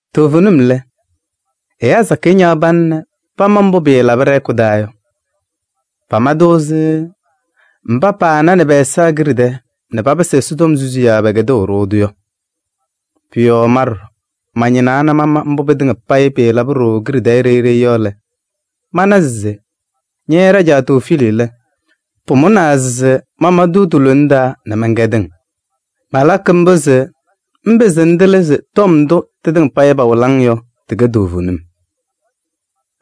Toovenim lɛ, ɛyaa sakɩyɛ ñaɣ pana nɛ pama mbʋ pɩɩlabɩ ɖɛ-hɛkʋ taa yɔ. Pama-tʋ ɛzɩ mba pananɩ pɛ-ɛza kiɖe tɛɛ nɛ papɩsɩ Ɛsɔtɔm susiyaa yɔ, pɛkɛdʋʋ-ɖʋ-tʋ yɔ. Pʋ-yɔɔ ma ɖɔɖɔ mañɩnaa nɛ mana mbʋ pɩtɩŋa payɩ pɩlaba ɖooo kiɖe tɛɛ ɖeyi ɖeyi yɔ lɛ, mana se ña ɖajaa Tewofiili lɛ, pʋmʋnaa se mama-tʋ ti-lona taa nɛ mɛnkɛdɩ-ŋ. Malakɩ mbʋ se ŋpɩzɩ ŋtɩlɩ se tɔm ndʋ tɩtɩŋa payɩ pawɩlɩ-ŋ yɔ, tɩkɛ toovenim.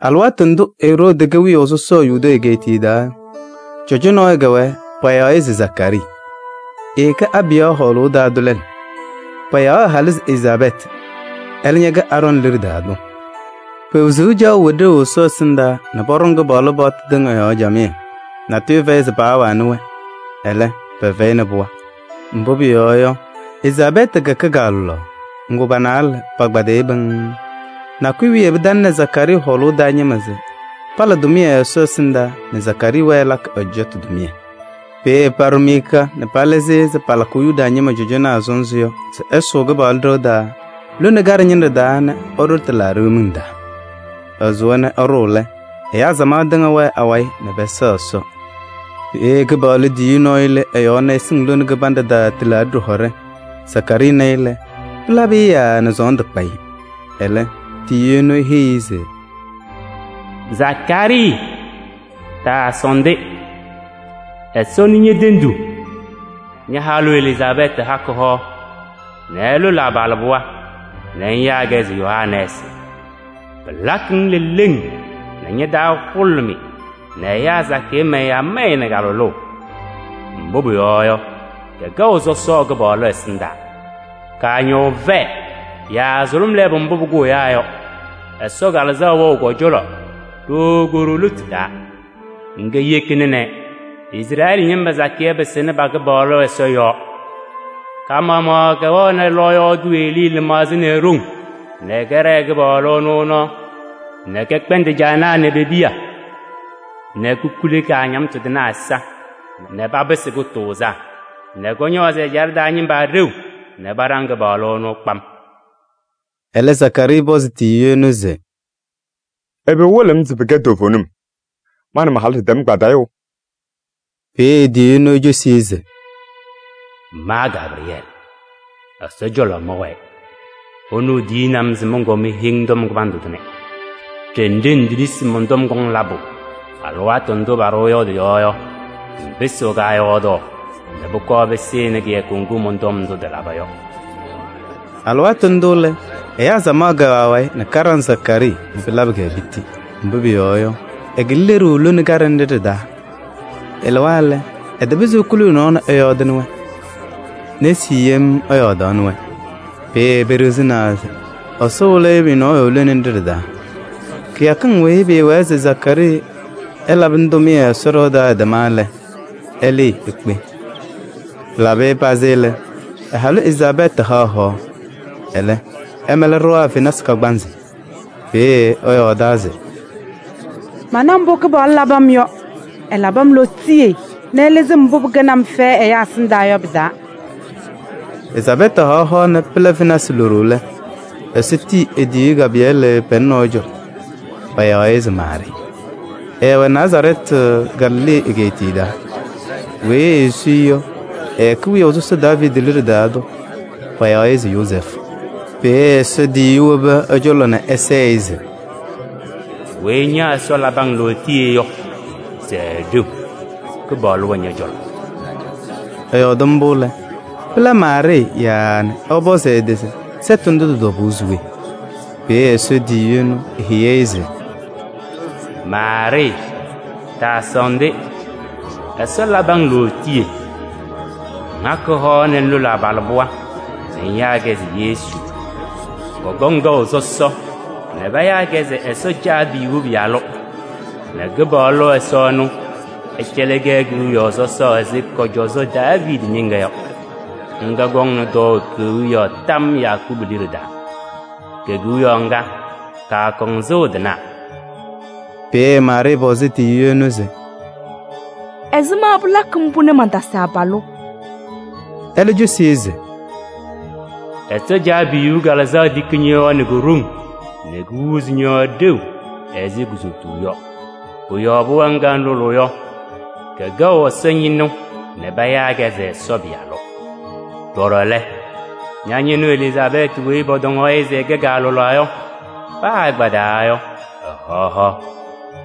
Alɩwaatʋ ndʋ Eroodi kɛ wiyaʋ sɔsɔ Yudee egeetiye taa yɔ, cɔjɔ nɔɔyʋ kɛwɛɛ, payaɣ-ɩ se Zakaarii. Ɛɛkɛ Abiya hɔɔlʋʋ taa tʋ lɛlʋ. Payaɣ ɛ-halʋ se Elizaabɛɛtɩ, ɛlɛ ñɛkɛ Aarɔɔnɩ liɖe taa tʋ. Pe-wezuu caɣʋ wɛ ɖeu Ɛsɔ ɛsɩndaa nɛ pɔɖɔŋ Kɩpaɣlʋ paɣtʋ tɩŋa yɔɔ camɩyɛ, natʋyʋ fɛyɩ se paawanɩ-wɛ. Ɛlɛ, pɛfɛyɩnɩ pɩɣa. Mbʋ pʋyɔɔ yɔ, Elizaabɛɛtɩ kɛ kaalʋlaɣ, ŋgʋ pa-naalɛ pakpaɖɩyɩ pɩŋŋ. Nakʋyʋ wiye pɩtalɩnɩ Zakaarii hɔɔlʋʋ taa ñɩma se pala tʋmɩyɛ Ɛsɔ ɛsɩndaa nɛ Zakaarii wɛɛ ɛlakɩ ɛ-cɔjɔtʋ tʋmɩyɛ. Peeye paɖʋ miika nɛ palɩzɩ-ɩ ɛzɩ palakʋʋ Yuda ñɩma cɔjɔnaa sɔnzɩ yɔ se ɛsʋʋ Kɩpaɣlʋ ɖɩɣa taa lone kaɖɛ ñɩnɖɛ taa nɛ ɛɖʋ tɩlaaɖɩ miŋ taa. Ɛsʋwa nɛ ɛɖʋʋ lɛ, ɛyaa samaɣ tɩŋa wɛɛ awayɩ nɛ pɛsɛɣ Ɛsɔ. Peeye Kɩpaɣlʋ tiyiyu nɔɔyʋ lɩ ɛ-yɔɔ nɛ ɛsɩŋ lone kɩbanɖɛ taa tɩlaaɖɩ ɖɩhɔɖɛ. Zakaarii na-ɩ lɛ, pɩlabɩ-ɩ yaaa nɛ sɔɔndʋ kpa-ɩ. Ɛlɛ, tiyiyu ɛnʋ eheyi-i se: “Zakaarii! Taasɔɔndɩ, Ɛsɔ nɩ ñe-tenduu. Ña-halʋ Elizaabɛɛtɩ hakɩ hoa nɛ ɛlʋlɩ abalɩbɩɣa nɛ ŋyaa-kɛ se Yohanɛɛsɩ. Pɩlakɩ-ŋ leleŋ nɛ ña-taa hʋlʋmɩ nɛ ɛyaa sakɩyɛ mayɩ amaya nɛ ka-lʋlʋʋ. Mbʋ pʋyɔɔ yɔ, kɛkɛɣ sɔsɔ Kɩpaɣlʋ ɛsɩndaa. Kaañɔʋ vɛɛ yaa sʋlʋm lɛɛbʋ mbʋ pʋkʋʋ ɛyaa yɔ. Ɛsɔ Kalɩzaɣ wɛɣ kɔ-cɔlɔ ɖooo ko-ɖoo lotu taa. Ŋga yekina nɛ Izrɛɛlɩ ñɩma sakɩyɛ pɩsɩnɩ pa-Kɩpaɣlʋ Ɛsɔ yɔɔ. Ka-maɣmaɣ kɛwɛɣnɩ lɔɔyaɣ tʋ Elii lɩmaɣza nɛ e-ɖoŋ nɛ kɛɖɛɛ Kɩpaɣlʋ ɛnʋ nɔɔ nɛ kɛkpɛndɩ caanaa nɛ pe-piya nɛ kokuli kaañamtʋ tɩnaa ɛza nɛ papɩsɩ kʋtʋʋzaa nɛ kɔñɔɔzɩ ɛjaɖɛ taa ñɩma ɖeu nɛ paɖaŋ Kɩpaɣlʋ ɛnʋ kpam.” Ɛlɛ, Zakaarii pɔzɩ tiyiyu ɛnʋ se: “Ɛbɛ wɩlɩɣ-m se pɩkɛ toovenim? Ma nɛ ma-halʋ ɖɩtɛm kpadɩyʋʋ!” Peeye tiyiyu ɛnʋ ecosi-i se: “Ma Gabrɩyɛɛlɩ, Ɛsɔ cɔlɔ mɛwɛɛ. Ɛnʋ tiyini-m se mɔnkɔɔ meheyi-ŋ tɔm kɩbandʋ tʋnɛ. Ɖenɖe ŋtetisi se mɔn-tɔm kɔŋ labʋ alɩwaatʋ ndʋ paɖʋwa yɔ tɩ-yɔɔ yɔ, ŋpɩsɩɣ kaayɔɔdaɣ nɛ pʋkɔɔ pɩsɩnɩ kɩyakʋ ŋgʋ mɔn-tɔm ndʋ tɩlaba yɔ.” Alɩwaatʋ ndʋ lɛ, ɛyaa samaɣ kɛwɛ awayɩ nɛ kaɖaŋ Zakaarii nɛ pɩlabɩ-kɛ piti. Mbʋ pʋyɔɔ yɔ, ɛkɩlɩ leɖuu lone kaɖɛ ñɩnɖɛ nɖɩ ɖɩ-taa. Ɛlɩwa lɛ, ɛtapɩzɩ ekuli ɛ-nɔɔ nɛ ɛyɔɔdɩnɩ-wɛ. Nesi yem ɛyɔɔɖaɣnɩ-wɛ. Peeye peɖiɣzinaa se Ɛsɔ wɩlɩ-ɩ pʋyʋ lone nɖɩ ɖɩ-taa. Kɩyakɩŋ weyi pʋwɛɛ se Zakaarii ɛlabɩnɩ tʋmɩyɛ Ɛsɔ ɖɩɣa taa yɔ ɩtɛma lɛ, ɛlɩɩ ekpe. Pɩlabɩ pazɩ lɛ, ɛ-halʋ Elizaabɛɛtɩ haɣ hoa. Ɛlɛ, ɛmɛlɩ ɖɩɣa fenasɩ kagbaanzɩ. Peeye ɛyɔɔdaa se: “Mana mbʋ Kɩpaɣlʋ labɩ-m yɔ: ɛlabɩ-m lootiye nɛ ɛlɩzɩ-m mbʋ pɩkɛnɩ-m fɛyɛ ɛyaa ɛsɩndaa yɔ pɩ-taa.” Elizaabɛɛtɩ haɣ hoa nɛ pɩla fenasɩ loɖo lɛ, Ɛsɔ tiyi e-tiyiyu Gabrɩyɛɛlɩ pɛlɛ nɔɔyʋ cɔlɔ, payaɣ-ɩ se Maarɩɩ. Ɛɛwɛ Nazarɛɛtɩ, Galilee egeetiye taa. Weyi esu-i yɔ, ɛkɛ wiyaʋ sɔsɔ Daaviidi liɖe taa tʋ, payaɣ-ɩ se Yozɛɛfʋ. Peeye Ɛsɔ tiyiyu wobi ɛ-cɔlɔ nɛ ɛsɛɛ-ɩ se: “Weyi ña Ɛsɔ labɩ-ŋ lootiye yɔ, sɛɛ ɖeu! Kɩpaɣlʋ wɛ ñɔ-cɔlɔ.” Ɛyɔɔdɩ mbʋ lɛ, pɩla Maarɩɩ yaaa nɛ ɛpɔzɩ ɛ-tɩ se sɛtʋ ndʋ tɩ-tɔbʋʋ se we? Peeye Ɛsɔ tiyiyu ɛnʋ eheyi-i se: “Maarɩɩ! Taasɔɔndɩ, Ɛsɔ labɩ-ŋ lootiye. Ŋhakɩ hoa nɛ ŋlʋlɩ abalɩbɩɣa nɛ ŋyaa-kɛ se Yesu. Kɔkɔŋ kɛʋ sɔsɔ nɛ payaa-kɛ se Ɛsɔ Caabiyuu Pɩyalʋ nɛ Kɩpaɣlʋ Ɛsɔ ɛnʋ, ɛcɛlɩ-kɛ kewiyaɣ sɔsɔɔ ɛzɩ kɔ-cɔzɔ Daaviidi ñɩŋga yɔ. Ŋga kɔŋnɩ tɔɔʋ kewiyaɣ tam Yakubu liɖe taa. Ke-kewiyaɣ ŋga, kaakɔŋ sɩʋ tɩnaɣ.” Peeye Maarɩɩ pɔzɩ Ɛsɔ tiyiyu ɛnʋ se: “Ɛzɩma pɩlakɩ mbʋ nɛ mantasɩ abalʋ?” Ɛlɛ cosi-i se: “Ɛsɔ Caabiyuu Kalɩzaɣ tiki ñɔ-yɔɔ nɛ ko-ɖoŋ nɛ kohuuzi ñɔ-yɔɔ ɖeu ɛzɩ kuzotuu yɔ. Pʋ-yɔɔ pɩɣa ŋga ŋlʋlʋʋ yɔ, kɛkɛɣ Ɛsɔ ñɩnʋ nɛ payaa-kɛ se: Ɛsɔ Pɩyalʋ. Ɖɔɖɔ lɛ, ña-ñɩnʋ Elizaabɛɛtɩ weyi pɔtɔŋaɣ-ɩ se ɛkɛ kaalʋlaɣ yɔ, paa ɛkpadɩyaa yɔ, ɛhaɣ hoa.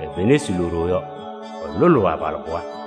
E-fenasɩ loɖo yɔ, ɛlʋlʋʋ abalɩbɩɣa.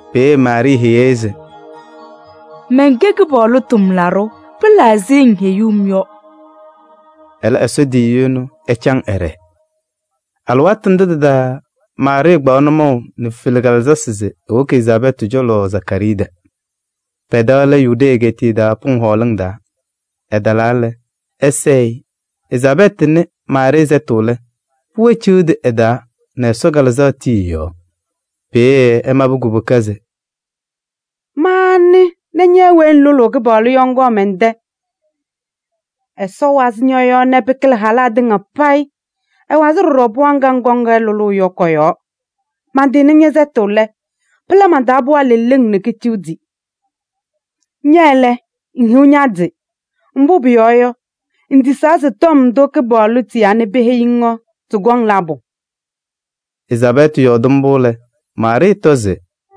Peeye Maarɩɩ heyi-i se: “Mɛnkɛ Kɩpaɣlʋ tʋmlaɖʋ. Pɩla ɛzɩ ŋheyuu-m yɔ.” Ɛlɛ Ɛsɔ tiyiyu ɛnʋ ɛcaŋ ɛɖɛɛ. Alɩwaatʋ ndʋ tɩ-taa Maarɩɩ kpaɣ nʋmɔʋ nɛ fezi kalalasɩ se ewoki Elizaabɛɛtɩ cɔlɔ Zakaarii tɛ. Pɛ-tɛ lɛ Yudee egeetiye taa pʋŋ hɔɔlɩŋ taa. Ɛtalaa lɛ, ɛsɛɛ-ɩ. Elizaabɛɛtɩ nɩ Maarɩɩ sɛtʋ lɛ, ɛ-pɩɣa ciɣdi ɛ-taa nɛ Ɛsɔ Kalɩzaɣ tii ɛ-yɔɔ. Peeye ɛmabɩ kubuka se: “Ma anɩ nɛ ña weyi ŋlʋlʋʋ Kɩpaɣlʋ yɔ, ŋkɔɔ mɛn-tɛ? Ɛsɔ wazɩ ñɔ-yɔɔ nɛ pɩkɩlɩ halaa tɩŋa payɩ. Ɛwazɩ ɖɔɖɔ pɩɣa ŋga ŋkɔŋ lʋlʋʋ yɔ kɔ-yɔɔ. Mantɩnɩ ñɛ-sɛtʋ lɛ, pɩla man-taa pɩɣa leleŋ nɛ keciɣdi. Ña lɛ, ŋhiɣ ña-tɩ! Mbʋ pʋyɔɔ yɔ, ŋtisaa se tɔm ndʋ Kɩpaɣlʋ tiyaa nɛ peheyi-ŋ yɔ, tɩkɔŋ labʋ yɔ.” Elizaabɛɛtɩ yɔɔdɩ mbʋ lɛ, Maarɩɩ tɔ se: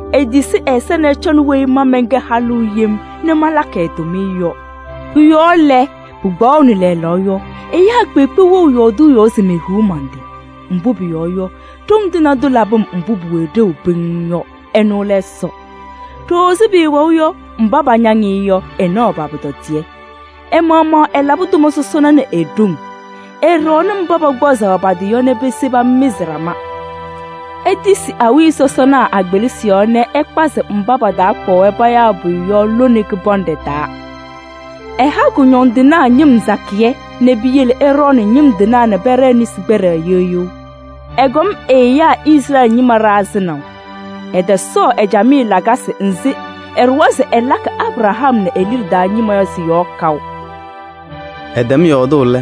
Etisi ɛ-ɛza nɛ ɛcɔnɩ weyi ma mɛnkɛ halʋ yem nɛ malakɩ ɛ-tʋmɩyɛ yɔ. Pʋ-yɔɔ lɛ, pɩkpaɣʋnɩ lɛɛlɛɛyɔ yɔ, ɛyaa kpeekpe wɛɣ yɔɔdʋʋ yɔɔ se mehiɣ man-tɩ. Mbʋ pʋyɔɔ yɔ, Ɖoŋ Tɩŋa Tʋ labɩ-m mbʋ pʋwɛ ɖeu pɩŋŋ yɔ. Ɛnʋ lɛ Ɛsɔ. Ɖooo ɛzɩ pʋwɛʋ yɔ, mba pañaŋ-ɩ yɔ, ɛnaɣ pa-pʋtɔdɩyɛ. Ɛ-maɣmaɣ ɛlabɩ tʋma sɔsɔna nɛ e-ɖoŋ: ɛɖɔɔnɩ mba pakpazɩɣ pa-tɩ yɔ nɛ pese pamɩzɩ ɖama. Etisi awiya sɔsɔna a-kpelisi yɔɔ nɛ ɛkpazɩ mba patakpaɣ-wɛ payaa pʋyʋ yɔ lone kɩbanɖɛ taa. Ɛha kʋñɔndɩnaa ñɩm sakɩyɛ nɛ piyele ɛɖɔɔnɩ ñɩm tɩnaa nɛ pɛɖɛɛ nesi kpɛɖɛ yeɣ yeɣ. Ɛkɔm ɛ-ɛyaa Izrɛɛlɩ ñɩma ɖa sɩnaʋ. Ɛtɔsɔɔ ɛ-camɩyɛ lakasɩ nzɩ ɛɖʋwa se ɛlakɩ Abraham nɛ e-liɖe taa ñɩma yɔ sɩ-yɔɔ kaʋ.” Ɛtɛm yɔɔdʋʋ lɛ,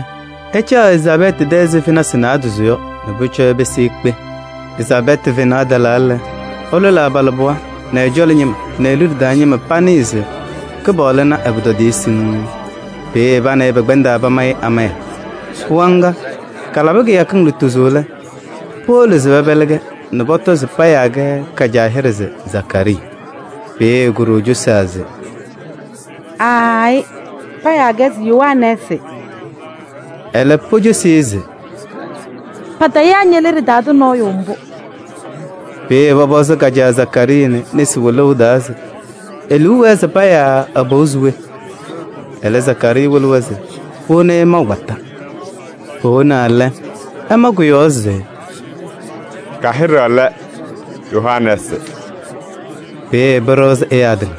ɛcaɣ Elizaabɛɛtɩ tɛ ɛzɩ fenasɩ naadozo yɔ nɛ pʋcɔ ɛpɩsɩ ekpe. Elizaabɛɛtɩ fenaɣ talaa lɛ, ɛlʋlɩ abalɩbɩɣa nɛ ɛ-cɔlɔ ñɩma nɛ e-liɖe taa ñɩma panɩɩ se Kɩpaɣlʋ na ɛ-pʋtɔdɩyɛ siŋŋ. Peeye pa nɛ ɩ pɛkpɛndaa pamayɩ amaya. Pɩɣa ŋga kalabɩ kɩyakɩŋ lutozo lɛ, powolo se pɛpɛlɩɣ-kɛ nɛ pɔtɔ se payaa-kɛ ka-caa hɩɖɛ se Zakaarii. Peeye ko-ɖoo cosaa se: “Aayɩ, payaa-kɛ se Yohanɛɛsɩ.” Ɛlɛ, pocosi-i se: “Patayaa ñe-liɖe taa tʋ nɔɔyʋ mbʋ.” Peeye pɔpɔzɩ ka-caa Zakaarii nɛ nesi wɩlʋʋ taa se e-liu wɛɛ se payaa ɛ-pɩɣa se we? Ɛlɛ Zakaarii wɩlɩ se powoni-i maʋ kpata. Powonaa lɛ, ɛma kʋ-yɔɔ se: “Ka-hɩɖɛ lɛ Yohanɛɛsɩ.” Peeye pɩɖɩɣzɩ ɛyaa tɩŋa.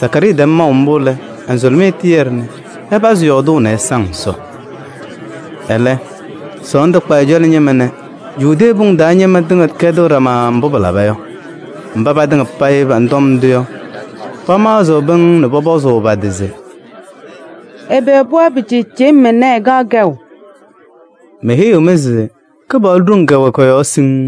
Zakaarii tɛm maʋ mbʋ lɛ, ɛ-nzʋlɩmɩyɛ tɩyɛdɩ nɛ ɛpazɩ yɔɔdʋʋ nɛ ɛsaŋ Ɛsɔ. Ɛlɛ sɔɔndʋ kpa ɛ-cɔlɔ ñɩma nɛ Yudee pʋŋ taa ñɩma tɩŋa kɛdɩɣ ɖama mbʋ pɩlaba yɔ. Mba patɩŋa panɩ tɔm ndʋ yɔ, pamaɣzɩ pɩŋŋ nɛ pɔpɔzʋʋ pa-tɩ se: “Ɛbɛ pɩɣa pɩcɩɩcɩyɩm ɛnɛ ɛkaɣ kɛʋ?” Meheyiɣ-mɩ se Kɩpaɣlʋ ɖoŋ kɛwɛ kɔ-yɔɔ siŋŋ.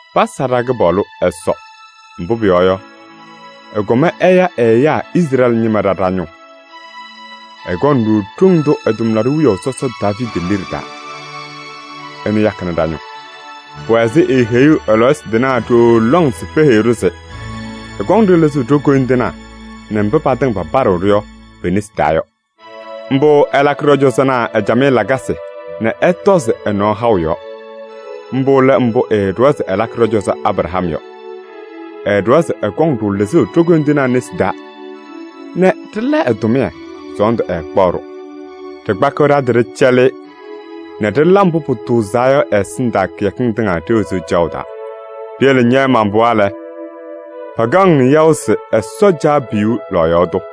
“Pasa ɖa-Kɩpaɣlʋ Ɛsɔ, mbʋ pʋyɔɔ yɔ, ɛkɔm ɛya ɛ-ɛyaa Izrɛɛlɩ ñɩma ɖa ɖa-ñʋʋ. Ɛkɔnɩ-ɖʋ ɖoŋ tʋ ɛ-tʋmlaɖʋ wiyaʋ sɔsɔ Daaviidi liɖe taa. Ɛnʋ yakɩnɩ ɖa-ñʋʋ. Pʋwɛ ɛzɩ eeheyuu ɛ-lɔɔyɩsɩ tɩnaa ɖooo lɔŋ se peheyi-ɖʋ se ɛkɔŋ-ɖʋ lɩzʋʋ ɖo-koyindinaa nɛ mba patɩŋa papaɖɩɣ-ɖʋ yɔ pe-nesi taa yɔ. Mbʋ ɛlakɩ ɖɔ-cɔzɔnaa ɛ-camɩyɛ lakasɩ nɛ ɛtɔzɩ ɛ-nɔɔ haʋ yɔɔ. Mbʋ lɛ mbʋ ɛɛɖʋwa se ɛlakɩ ɖɔ-cɔzɔ Abraham yɔ. Ɛɖʋwa se ɛkɔŋ-ɖʋ lɩzʋʋ ɖo-koyindinaa nesi taa nɛ ɖɩla ɛ-tʋmɩyɛ, sɔɔndʋ ɛɛkpaɣ-ɖʋ. Ɖɩkpakɩɣ ɖa-tɩ ɖɩcɛlɩ-ɩ nɛ ɖɩla mbʋ pʋtʋʋzaa yɔ ɛ-ɛsɩndaa kɩyakɩŋ tɩŋa ɖe-wezuu caɣʋ taa. Piyele ña man-pɩɣa lɛ, pakaɣ-ŋ yaʋ se Ɛsɔ Caabiyuu lɔɔyaɣ tʋ.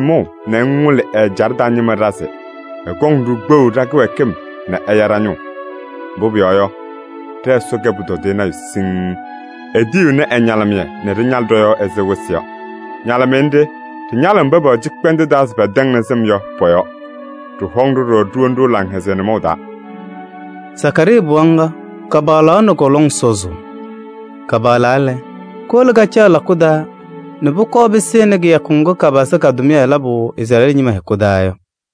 ŋwɩlɩ ɛ-ɛjaɖɛ taa ñɩma ɖa se ɛkɔŋ-ɖʋ kpeɣu ɖa-kɩwɛɛkɩm nɛ ɛya ɖa-ñʋʋ. Mbʋ pʋyɔɔ yɔ, ɖɛ-Ɛsɔ kɛ pʋtɔdɩyɛ nayʋ siŋŋ: etiyiɣni ɛ-ñalɩmɩyɛ nɛ ɖɩñalɩ ɖɔ-yɔɔ ɛzɩ wɩsɩ yɔ. Ñalɩmɩyɛ nɖɩ ɖɩñalɩɣ mba pɛwɛ cɩkpɛndʋʋ taa se pɛtɛŋnɩ sɩm yɔ pɔ-yɔɔ. Ɖɩhɔŋ-ɖʋ ɖɔɖɔ nɛ ɖiwoni laŋhɛzɩyɛ nʋmɔʋ taa.” Zakaarii pɩɣa ŋga kapaɣlaɣ nɛ kɔ-lɔŋ sɔzʋʋ. Kapaɣlaa lɛ, kowolo kacaɣ lakʋ taa nɛ pʋkɔɔ pɩsɩnɩ kɩyakʋ ŋgʋ kapazɩ ka-tʋmɩyɛ labʋ Izrɛɛlɩ ñɩma hɛkʋ taa yɔ.